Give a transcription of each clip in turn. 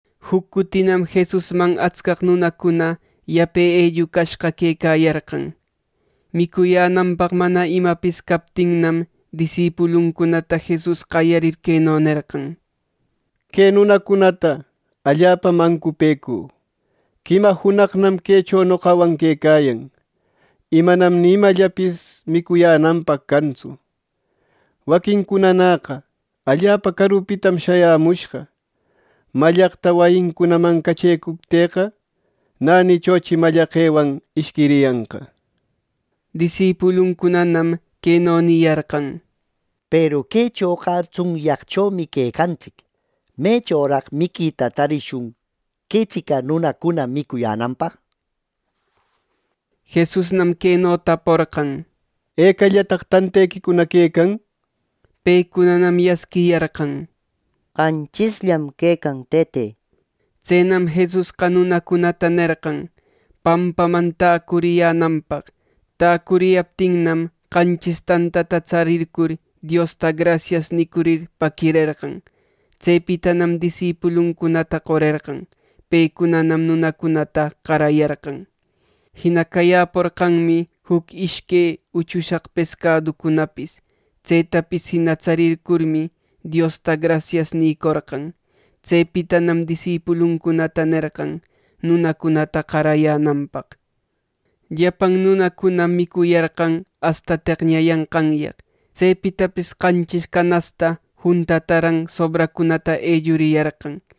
Juc cutinam Jesusman atscaq nunacuna yape ellucayashqa quecayarqan. Micuyänanpaq mana imapis captinnam, disipuluncunata Jesus qayarir queno nerqan: —Que nunacunata allapam ancupëcü. Quima junaqnam quecho noqawan quecayan; y manam ni imallapis micuyänanpaq cantsu. Waquincunanäqa allapa carupitam shayämushqa, mallaqta wayincunaman cachecuptïqa, nänichochi mallaqewan ishquiriyanqa. Disipuluncunanam queno niyarqan: —Peru quechoqa tsunyaqchomi quecantsic. ¿Mechoraq miquita tarishun quetsica nunacuna micuyänanpaq! —nir. Jesusnam queno taporqan: —¿Ecallataq tantequicuna quecan? —nir. Pecunanam yasquiyarqan: —Qanchisllam quecan, Tëte —nir. Tsenam Jesusqa nunacunata nerqan pampaman täcuriyänanpaq. Täcuriyaptinnam, qanchis tantata tsarircur, Diosta “grasias” nicurir paquirerqan. Tsepitanam disipuluncunata qorerqan. Pecunanam nunacunata qarayarqan. Jina cayäporqanmi juc ishque uchusaq pescaduncunapis. Tsetapis jina tsarircurmi, Diosta “Grasias” nïcorqan. Tsepitanam disipuluncunata nerqan nunacunata qarayänanpaq. Llapan nunacunam micuyarqan asta teqñayanqanyaq. Tsepitapis qanchis canasta juntataran sobraqcunata elluriyarqan.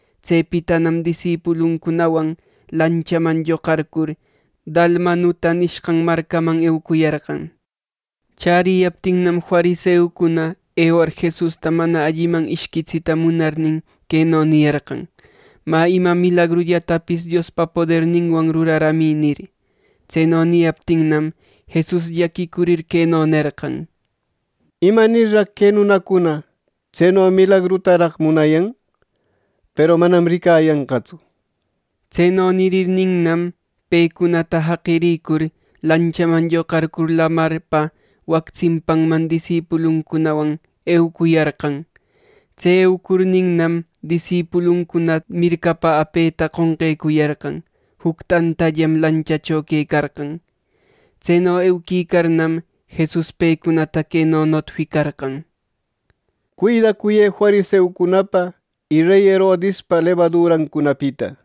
Tsepitanam disipuluncunawan lanchaman lloqarcur Dalmanuta nishqan marcaman eucuyarqan. Chäriyaptinnam, fariseucuna ewar Jesusta mana alliman ishquitsita munarnin, queno niyarqan: —Mä, ima milagrullatapis Diospa poderninwan ruraramï —nir. Tseno niyaptinnam, Jesus llaquicurir, queno nerqan: —¿Imanirraq que nunacuna tseno milagrutaraq munayan? Peru manam ricayanqatsu. Tseno nirirninnam, pecunata jaqirïcur lanchaman lloqarcur lamarpa wac tsimpanman disipuluncunawan eucuyarqan. Tse eucurninnam, disipuluncuna mircapa apeta qonqecuyarqan. Juc tantallam lanchacho quecarqan. Tseno euquicarnam, Jesus pecunata queno notificarqan: —Cuidacuyë fariseucunapa y rey Herodispa lebadurancunapita —nir.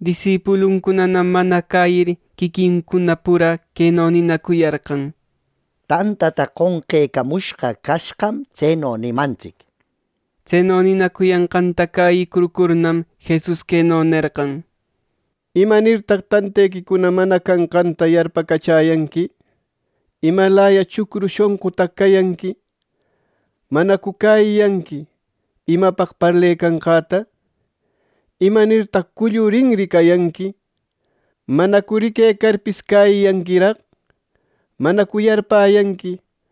Disipuluncunanam mana cäyir, quiquincuna pura queno ninacuyarqan: —Tantata qonqecamushqa cashqam tseno nimantsic —nir. Tseno ninacuyanqanta cäyicurcurnam, Jesus queno nerqan: —¿Imanirtaq tantequicuna mana canqanta yarpacachäyanqui? ¿Imalaya chucru shonqutaq cayanqui? ¿Manacu cäyiyanqui imapaq parlecanqäta? ¿Imanirtaq cullu rinri cayanqui! ¿Manacu riquecarpis cäyiyanquiraq! ¿Manacu yarpäyanqui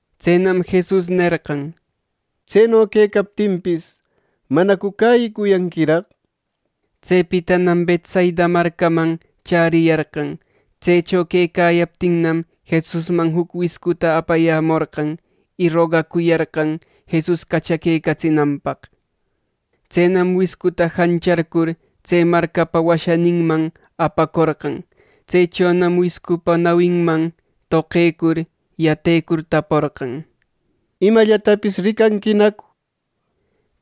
Tsenam Jesus nerqan: —Tseno quecaptinpis, ¿manacu cäyicuyanquiraq! Tsepitanam Betsaida marcaman chäriyarqan. Tsecho quecayaptinnam, Jesusman juc wiscuta apayämorqan, y rogacuyarqan Jesus cachaquecatsinanpaq. Tsenam wiscuta jancharcur tse marcapa washaninman apacorqan. Tsechonam wiscupa nawinman toqecur, yatecur taporqan: —¿Imallatapis ricanquinacu? —nir.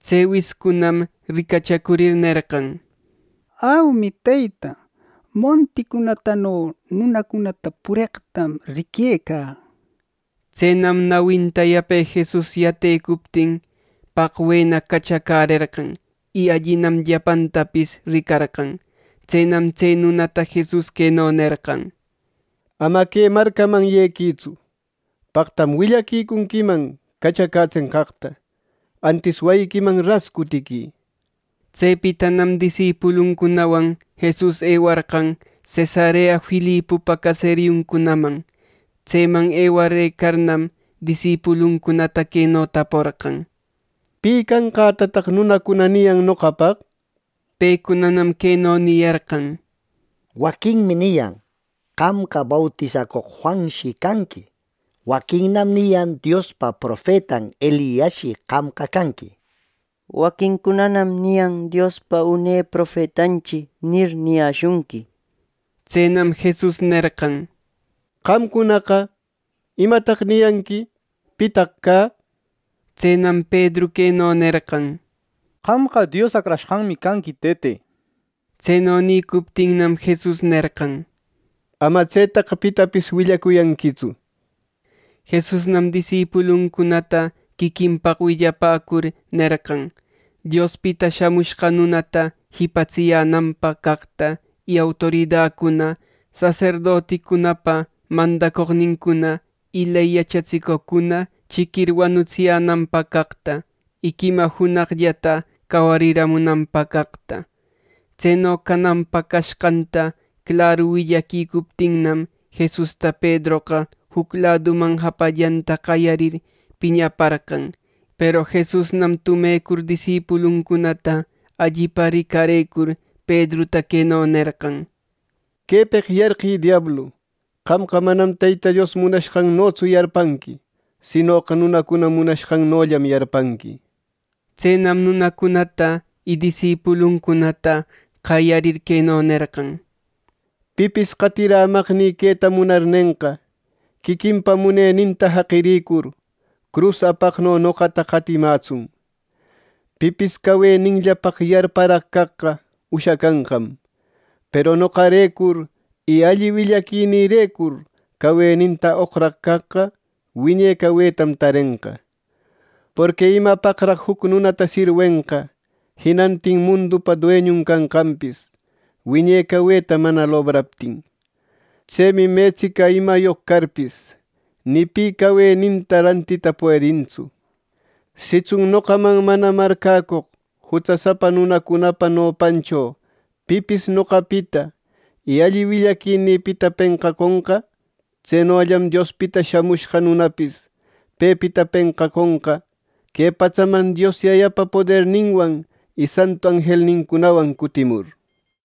Tse wiscunam ricachacurir nerqan: —Aumi, Teyta. Monticunatano nunacunata pureqtam riquecä. Tsenam nawinta yape Jesus yatecuptin, paqwena cachacärerqan, y allinam llapantapis ricarqan. Tsenam tse nunata Jesus queno nerqan: —Ama que marcaman yequïtsu ˻paqtam willaquicunquiman cachacätsenqaqta, antis wayiquiman ras cutiquï˼ —nir. Tsepitanam disipuluncunawan Jesus ewarqan Cesarea Filipopa caseriuncunaman. Tseman ewarëcarnam, disipuluncunata queno taporqan: —¿Pi canqätataq nunacuna niyan noqapaq? Pecunanam queno niyarqan: —Waquinmi niyan qamqa bautisacoq Juanshi canqui. Waquinnam niyan Diospa profetan Eliasshi qamqa canqui. Waquincunanam niyan “Diospa une profetanchi” nir, niyäshunqui. Tsenam Jesus nerqan: —Qamcunaqa, ¿imataq niyanqui? ¿Pitaq cä? Tsenam Pedru queno nerqan: —Qamqa Dios Acrashqanmi canqui, Tëte —nir. Tseno nïcuptinnam, Jesus nerqan: —Ama tsetaqa pitapis willacuyanquitsu —nir. Jesusnam disipuluncunata quiquinpaq willapäcur nerqan Diospita Shamushqa Nunata jipatsiyänanpaq caqta, y autoridacuna, saserdoticunapa mandacoqnincuna y ley yachatsicoqcuna chiquir wanutsiyänanpaq caqta, y quima junaqllata cawariramunanpaq caqta. Tseno cananpaq cashqanta claru willaquicuptinnam, Jesusta Pedroqa juc laduman japallanta qayarir piñaparqan. Peru Jesusnam tumecur disipuluncunata allipa ricarëcur, Pedruta queno nerqan: —¡Quepeq yarqï, diablu! Qamqa manam Teyta Dios munashqannotsu yarpanqui; sinoqa nunacuna munayashqannollam yarpanqui. Tsenam nunacunata y disipuluncunata qayarir queno nerqan: —Pipis qatirämaqnï queta munarnenqa, quiquinpa muneninta jaqiricur, crus apaqno noqata qatimätsun. Pipis caweninllapaq yarparaq caqqa ushacanqam; peru noqarecur y alli willaquinïrecur caweninta oqraq caqqa wine cawetam tarenqa. Porqui ¿imapaqraq juc nunata sirwenqa jinantin mundupa dueñun canqanpis, wiñe caweta mana lobraptin! Tsemi metsica imayoq carpis, ni pi caweninta rantita puedintsu. Sitsun noqaman mana marcäcoq jutsasapa nunacunapa nopancho pipis noqapita y alli willaquinïpita penqaconqa; tsenollam Diospita Shamushqa Nunapis pepita penqaconqa que patsaman Dios Yayapa poderninwan y santu anjelcunawan cutimur.